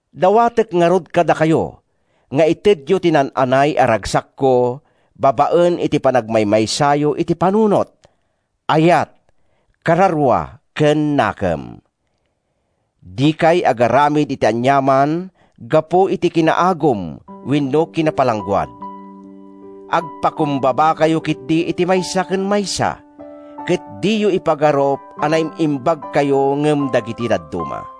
Dawatek ngarud kadakayo nga itedyo ti naan-anay a ragsakko babaen iti panagmaymaysayo iti panunot, ayat, kararua ken nakem. Dikay agaramid iti aniaman gapu iti kinaagum wenno kinapalangguad. Agpakumbabakayo ketdi iti maysa ken maysa ket diyo ipagarup a naim-imbagkayo ngem dagiti dadduma.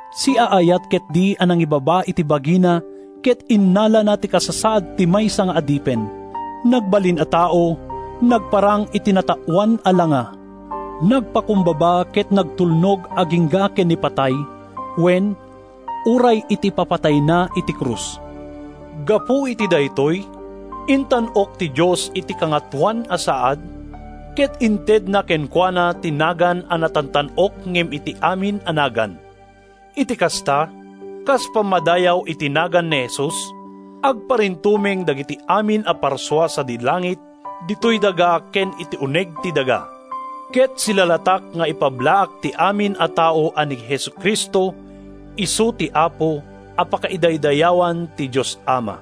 Siaayat ketdi a nangibaba iti bagina Ket innalana ti kasasaad ti maysa nga adipen. Nagbalin a tao, nagparang iti nataoan a langa. Nagpakumbaba ket nagtulnog agingga ken ni patay, wen, uray iti ipapatayna iti krus. Gapu iti daytoy, intan-ok ti Dios iti kangatoan a saad, Ket intedna kenkuana ti nagan a natantan-ok ngem ti amin a nagan. Iti kasta, kas pammadayaw iti nagan ni Jesus, Agparintumeng dagiti amin a parsua sadi langit, ditoy daga ken iti uneg ti daga. Ket silalatak nga ipablaak ti amin a tao a ni Jesu-Cristo isu ti Apo, a pakaidaydayawan ti Dios Ama.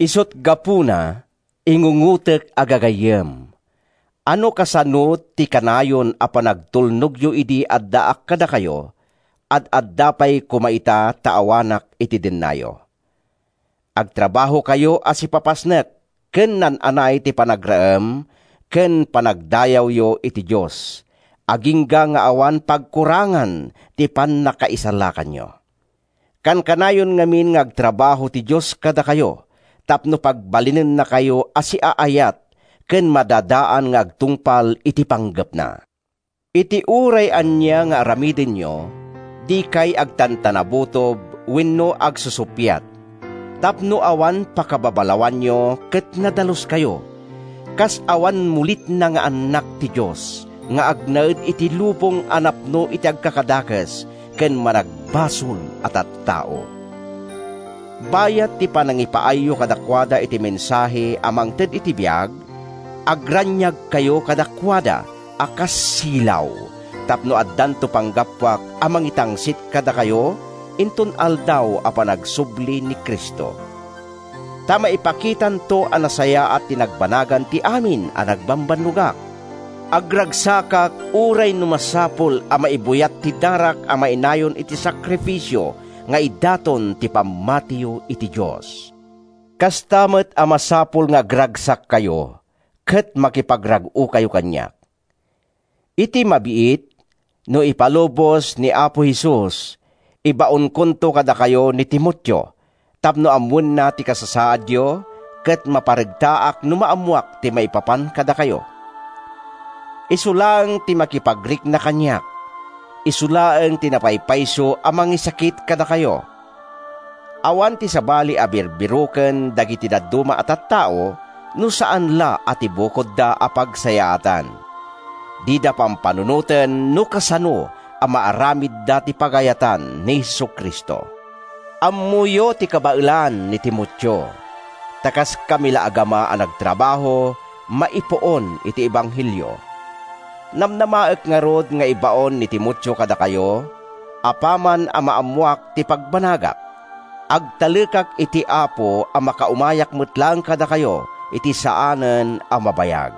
Isut’ gapuna, ingungotek a gagayyem, a no kasano ti kanayon a panagtulnogyo idi addaak kadakayo, ad-adda pay koma ita ta awanak iti dennayo. Agtrabahokayo a sipapasnek ken naan-anay ti panagraem ken panagdayawyo iti Dios agingga nga awan pagkurangan ti pannakaisalakanyo. Kankanayon ngamin nga agtrabaho ti Dios kadakayo tapno pagbalinennakayo a siaayat ken madadaan nga agtungpal iti panggepna. Iti uray ania nga aramidenyo, dikay agtantanabutob wenno agsusuppiat, tapno awan pakababalawanyo ket nadaluskayo, kas awan mulitna nga annak ti Dios nga agnaed iti lubong a napno iti agkakadakes ken managbasol a tattao. Bayat ti panangipaayyo kadakuada iti mensahe a mangted iti biag, agraniagkayo kadakuada a kas silaw tapno addanto panggapuak a mangitangsit kadakayo inton Aldaw a panagsubli ni Cristo. Ta maipakitanto a nasayaat ti nagbanagan ti amin a nagbambannogak. Agragsakak uray no masapul a maibuyat ti darak a mainayon iti sakrifisio nga idaton ti pammatiyo iti Dios. Kasta met a masapul nga agragsakkayo ket makipagrag-okayo kaniak. Iti mabiit, no ipalubos ni Apo Jesus, ibaonkonto kadakayo ni Timoteo tapno ammoenna ti kasasaadyo ket maparegtaak no maammoak ti maipapan kadakayo. Isu laeng ti makipagrikna kaniak. Isu laeng ti napaypayso a mangisakit kadakayo. Awan ti sabali a birbiroken dagiti dadduma a tattao no saan la a ti bukodda a pagsayaatan. Dida pampanunoten no kasano a maaramidda ti pagayatan ni Jesu-Cristo. Ammoyo ti kabaelan ni Timoteo, ta kaskami la agama a nagtrabaho maipuon iti ebanghelio. Namnamaek ngarud nga ibaon ni Timoteo kadakayo apaman a maammoak ti pagbanagak. Agtalekak iti Apo a makaumayak met laengen kadakayo iti saanen a mabayag.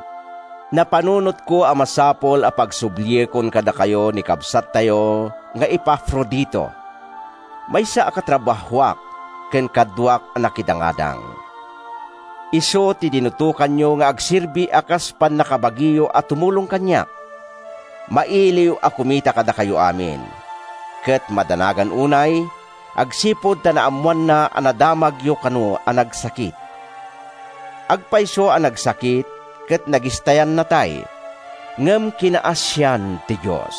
Napanunotko a masapul a pagsubliekon kadakayo ni kabsattayo nga Epafrodito, maysa a katrabahoak ken kaduak a nakidangadang. Isu ti dinutokanyo nga agserbi a kas pannakabagiyo a tumulong kaniak. Mailiw a kumita kadakayo amin, ket madanagan unay agsipud ta naammoanna a nadamagyo kano a nagsakit. Agpayso a nagsakit ket nagistayan natay, ngem kinaasian ti Dios.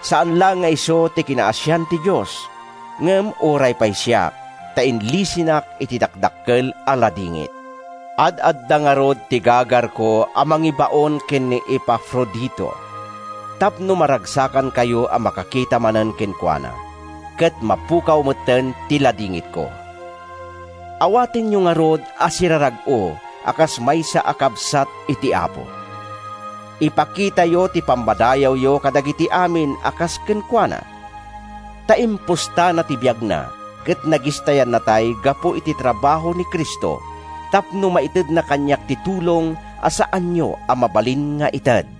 Saan laeng nga isu ti kinaasian ti Dios, ngem uray pay siak, ta inlisinak iti dakdakkel a ladingit. Ad-adda ngarud ti gagarko a mangibaon ken ni Epafrodito, tapno maragsakankayo a makakita manen kenkuana, ket mapukaw metten ti ladingitko. Awatenyo ngarud a sirarag-o a kas maysa a kabsat iti Apo. Ipakitayo ti pammadayawyo kadagiti amin a kas kenkuana, ta impustana ti biagna ket nagistayan natay gapu iti trabaho ni Cristo tapno maitedna kaniak ti tulong a saanyo a mabalin nga ited.